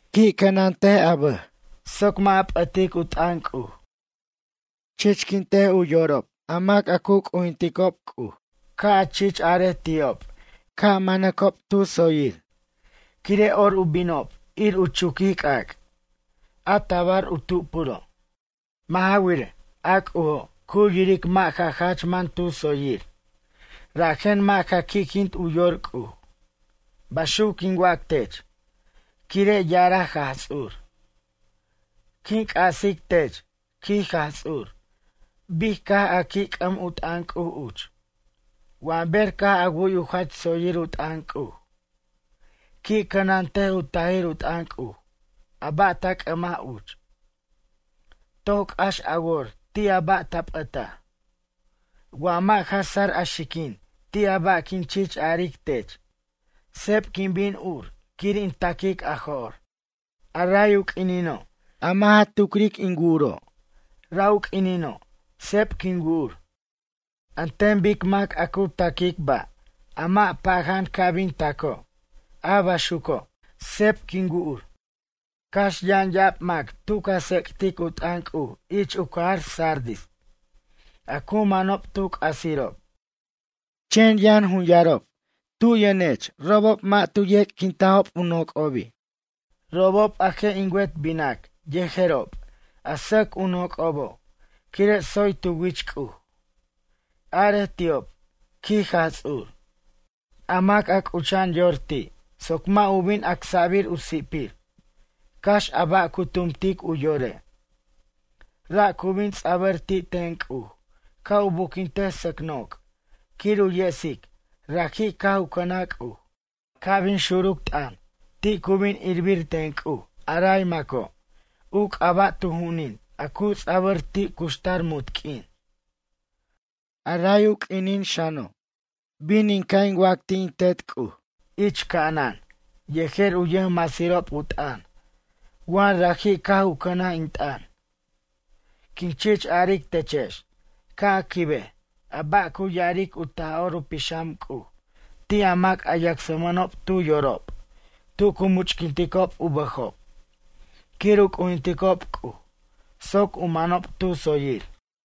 Qui' cʌnant a bʌj soc mʌ' a p'ʌtic u t'ʌn C'uj. Chichquint u yorob a mac a cu c'ujinticob C'uj, ca' a chich arej ti'ob ca' manacob tu tsoyir quire' or u binob, ir u chuquij c'ac', a tabar u tupuro'. Mʌ' ja wirej, a C'ujo' cu yiric mʌ' ja jach man tu tsoyir, rajen mʌ' ja qui'quint u yor C'uj. Baxuc quin wac tech, quire' ya'araj Jaj Ts'ur. Quin c'asic tech, quij Jaj Ts'ur, bic caj a qui' c'ʌm u t'ʌn C'uj uch, wa ber caj a wu'y u jach tsoyir u t'ʌn C'uj. Qui' cʌnantej u tajir u t'ʌn C'uj, a ba' ta c'ʌmaj uch. Toc c'ax a wor ti' a ba' ta p'ʌtaj. Wa mʌ' ja sar a xiquin ti' a ba' quin chich aric tech, seb quin bin ur quir in taquic a jo'r, a ray u q'uinino' a mʌ' ja tucr in wu'uro', ra' u q'uinino' seb quin wu'ur, an ten bic mac a cu ta'quic ba', a mʌ' paja'an ca' bin taco' a baxuco', seb quin wu'ur. Cax yʌn ya'ab mac tu ca tsec'tic u t'ʌn C'uj ich u cajar Sardis, a cu manob tu c'asirob, chen yʌn jun yarob tu yʌnech robob mʌ' tu ec'quinta'b u noc'obi', robob a je' in wet binac yejerob a sʌc u noc'obo' quire' tsoy tu wich C'uj.” Arej ti'ob ―quij Jaj Ts'ur―: “A mac a c'ucha'an yor ti' soc mʌ' u bin acsa'bir u si'pir, cax a ba' cu tumtic u yore'. Ra' cu bin ts'a'bʌr ti' ten C'uj ca' u buquintej sʌc noc' quir u yesic raji' caj u cʌnaj C'uj. Ca' bin xuruc t'ʌn, ti' cu bin irbir ten C'uj a ray maco' u c'aba' tu ju'unin a cu ts'abʌr ti' cuxtar munt q'uin. A ray u q'uinin xano', bin in ca' in wac ti' in Tet C'uj ich ca'anan yejer u yʌjmasirob u t'ʌn wa raji' caj u cʌnaj in t'ʌn. Quin chich aric techex ca' a quibej a ba' cu ya'aric u Taj'or u Pixam C'uj ti' a mac a yacsmʌnob tu yorob tu cu much'quinticob u bʌjob quir u c'ujinticob C'uj soc u manob tu tsoyir.”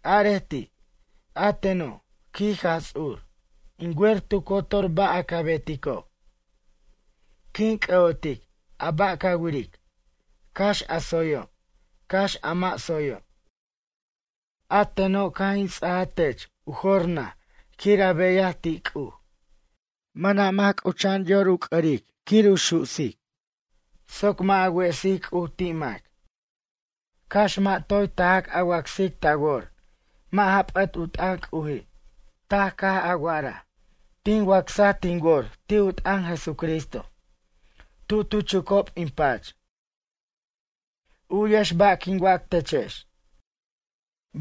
Arej ti': “A teno', quij Jaj Ts'ur, In wer tu cotor ba' a ca betico'. Quin c'ʌ'otic a ba' ca wiric, cax a tsoyo', cax a mʌ' tsoyo'. A teno' caj in ts'ajaj tech u jor naj quir a beyaj ti' C'uj. Mʌna' mac c'ucha'an yor u c'ʌric quir u su'sic soc mʌ' a wesic C'uj ti' mac. Cax mʌ' toy tajac a wacsic ta wor mʌ' ja p'ʌt u t'ʌn C'uji'. Taj caj a wa'araj: Tin wacsaj tin wor ti' u t'ʌn Jesucristo, tu tu chucob in pach. U'yex ba' quin wac techex.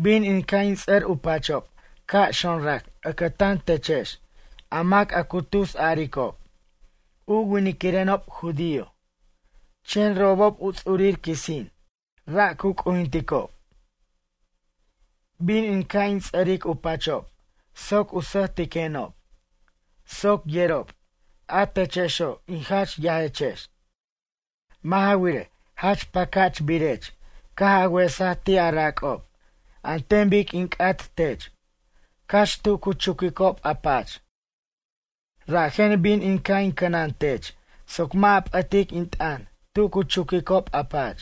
Bin in ca' in ts'ʌr u pachob ca' xonrac ʌcʌtan techex a mac a cu tus aricob: U winquirenob judío, chen robob u ts'urir quisin, ra' cu c'ujinticob. Bin in ca' in ts'ʌric u pachob soc u sʌjtiquenob, soc yerob, a techexo' in jach yajechex. Mʌ' ja wirej, jach pacachbirech caj a wesaj ti' a rac'ob an ten bic in c'at tech, cax tu cu chuquicob a pach, rajen bin in ca' in cʌnantech soc mʌ' a p'ʌtic in t'ʌn tu cu chuquicob a pach.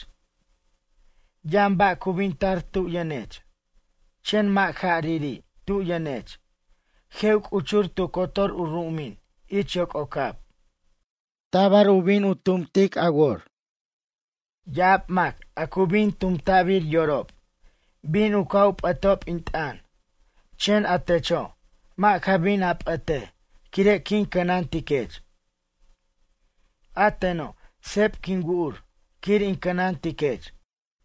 Yʌn ba' cu bin tar tu yʌnech, chen mʌ' jariri' tu yʌnech, je' u c'uchur tu cotor u ru'umin ich yoc'ocab. Tabar u bin u tumt a wor. Ya'ab mac a cu bin tumta'bir yorob, bin u ca' u p'ʌtob in t'ʌn, chen a techo' mʌ' ja bin a p'ʌtej quire' quin cʌnantiquech. A teno', seb quin wu'ur quir in cʌnantiquech.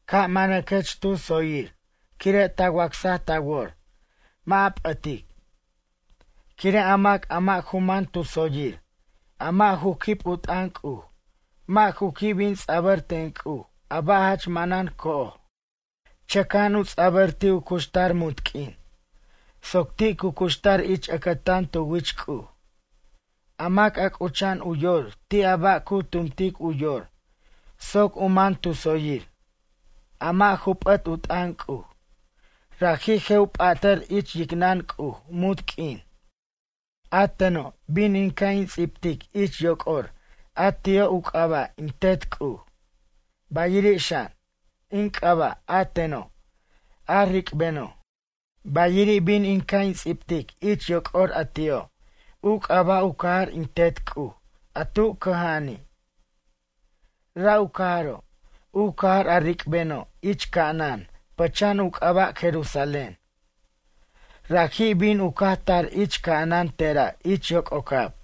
Ca' manaquech tu tsoyir quire' ta wacsaj ta wor, mʌ' a p'ʌtic. Quire' a mac a mʌ' ju man tu tsoyir, a mʌ' ju quib u t'ʌn C'uj mʌ' ju qui' bin ts'abʌr ten C'uj a ba' jach manan co'oj. Chʌca'an u ts'abʌr ti' u cuxtar munt q'uin, soc ti' cu cuxtar ich ʌcʌtan tu wich C'uj. A mac a c'ucha'an u yor ti' a ba' a cu tumtic u yor soc u man tu tsoyir, a mʌ' ju p'ʌt u t'ʌn C'uj, raji' je' u p'atʌr ich yicnʌn C'uj munt q'uin. A teno', bin in ca' in ts'ibtic ich yoc'or a ti'o' u c'aba' in Tet C'uj, bayiri' xan, in c'aba' a teno', a ric'beno'. Bayiri' bin in ca' in ts'ibtic ich yoc'or a ti'o', u c'aba' u cajar in Tet C'uj a tu cʌja'ani'. Ra' u cajaro', u cajar a ric'beno' ich ca'anan pʌcha'an u c'aba' Jerusalén. Raji' bin u caj tar ich ca'anan tera' ich yoc'ocab.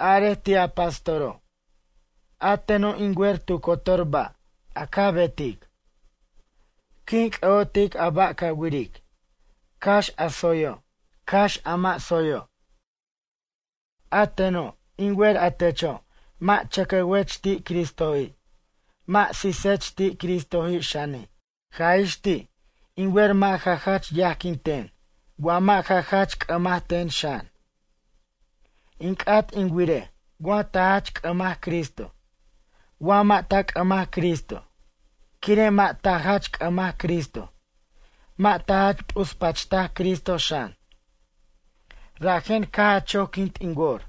Arej ti' a pastoro': “A teno' in wer tu cotor ba' a ca betic. Quin c'ʌ'otic a ba' ca wiric, cax a tsoyo', cax a mʌ' tsoyo'. A teno', in wer a techo' mʌ' chʌcowech ti' Cristoji', mʌ' sisech ti' Cristo xani', jaj ix ti' in wer mʌ' a jach yajquin ten wa mʌ' ja jach c'ʌmaj ten xan. In c'at in wirej wa ta jach c'ʌmaj Cristo, wa mʌ' ta c'ʌmaj Cristo. Quire' mʌ' ta jach c'ʌmaj Cristo, mʌ' ta jach p'uspachtaj Cristo xan, rajen caj a choquint in wor,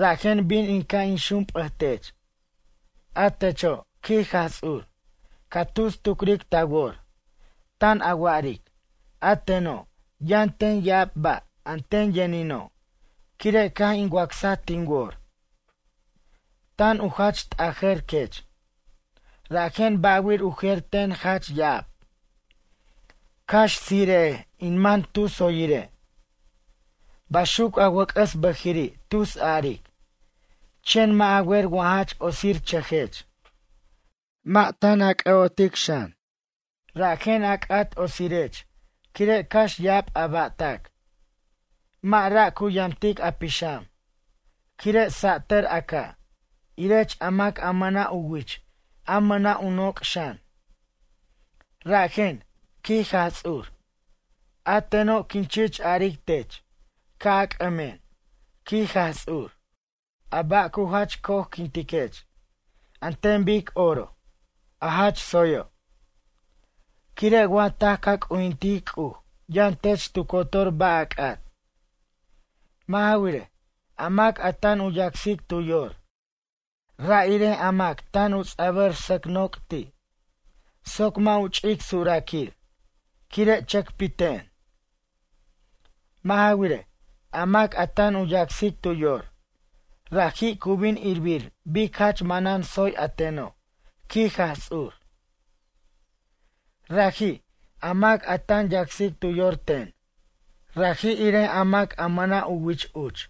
rajen bin in ca' in xump'ʌtech. A techo', quij Jaj Ts'ur, ca tus tucric ta wor, tan a wa'aric: A teno', yʌn ten ya'ab ba' a ten yʌnino', quire' caj in wacsaj tin wor. Tan u jach t'ajʌr, quech, rajen ba'wir u jer ten jach ya'ab, cax tsire'ej in man tu tsoyire'. Baxuc a wʌc'ʌs bʌjiri' tus aric, chen mʌ' a wer wa jach otsirchʌjech, mʌ' tan ja c'ʌ'otej xan. Rajen a c'at otsirirech quire' cax ya'ab a ba'tac, mʌ' ra' cu yamtic a pixam, quire' sa'tʌr a ca', irech a mac a mʌna' u wich, a mʌna' u noc' xan. Rajen, quij Jaj Ts'ur, a teno', quin chich aric tech ca' a c'ʌmen, quij Jaj Ts'ur, a ba' cu jach co'ojquintech an ten bic oro, a jach tsoyo'. Quire' wa taj ca c'ujintic C'uj yʌn tech tu cotor ba' a c'at. Mʌ' ja wirej, a mac a tan u yacsic tu yor, ra' irej a mac tan u ts'abʌr sʌc' noc' ti', soc mʌ' u ch'ic suraquir, quire' chʌcpiten. Mʌ' ja wirej, a mac a tan u yacsic tu yor, raji' cu bin irbir bic jach manan tsoy a teno', quij Jaj Ts'ur. Raji', a mac a tan yacsic tu yor ten, raji' irej a mac a mʌna' u wich uch,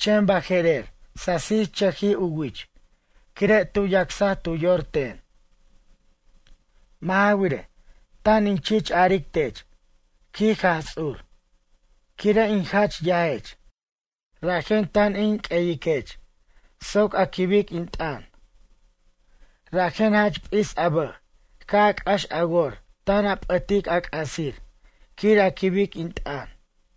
chen baje'rer sasichʌjij u wich quire' tu yacsaj tu yor ten. Mʌ' ja wirej, tan in chich aric tech, quij Jaj Ts'ur, quire' in jach yajech, rajen tan in q'ueyiquech soc a quibic in t'ʌn. Rajen jach p'is a bʌj ca' a c'ax a wor tan a p'ʌtic a c'asir quir a quibic in t'ʌn.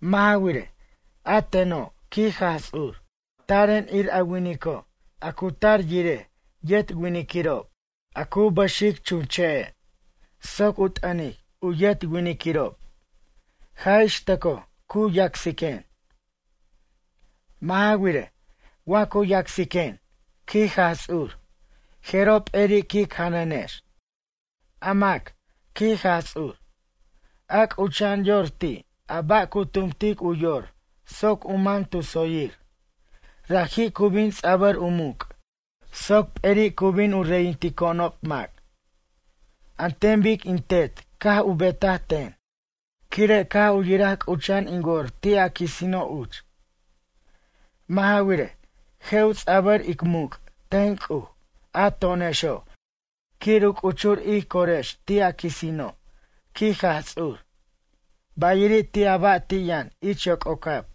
Mʌ' ja wirej, a teno', quij Jaj Ts'ur, taren ir a winico' a cu tar yirej yet winiquirob, a cu bʌxic chunche'e, soc u t'ʌnic u yet winiquirob, jaj ix tʌco cu yacsiquen. Mʌ' ja wirej, wa cu yacsiquen, quij Jaj Ts'ur, jeroj p'eri quic janʌnex. A mac, quij Jaj Ts'ur, a c'ucha'an yor ti' a ba' cu tumtic u yor soc u man tu tsoyir, raji' cu bin ts'abʌr u muc' soc p'eri' cu bin u reyintico'onob mac. An ten bic in Tet caj u betaj ten, quire' caj u yiraj c'ucha'an in wor ti' a quisino' uch. Mʌ' ja wirej, je' u ts'abʌr ic muc' ten C'uj a to'onexo' quir u c'uchur ij corex ti' a quisino', quij Jaj Ts'ur, bayiri' ti' a ba' a ti' yʌn ich yoc'ocab.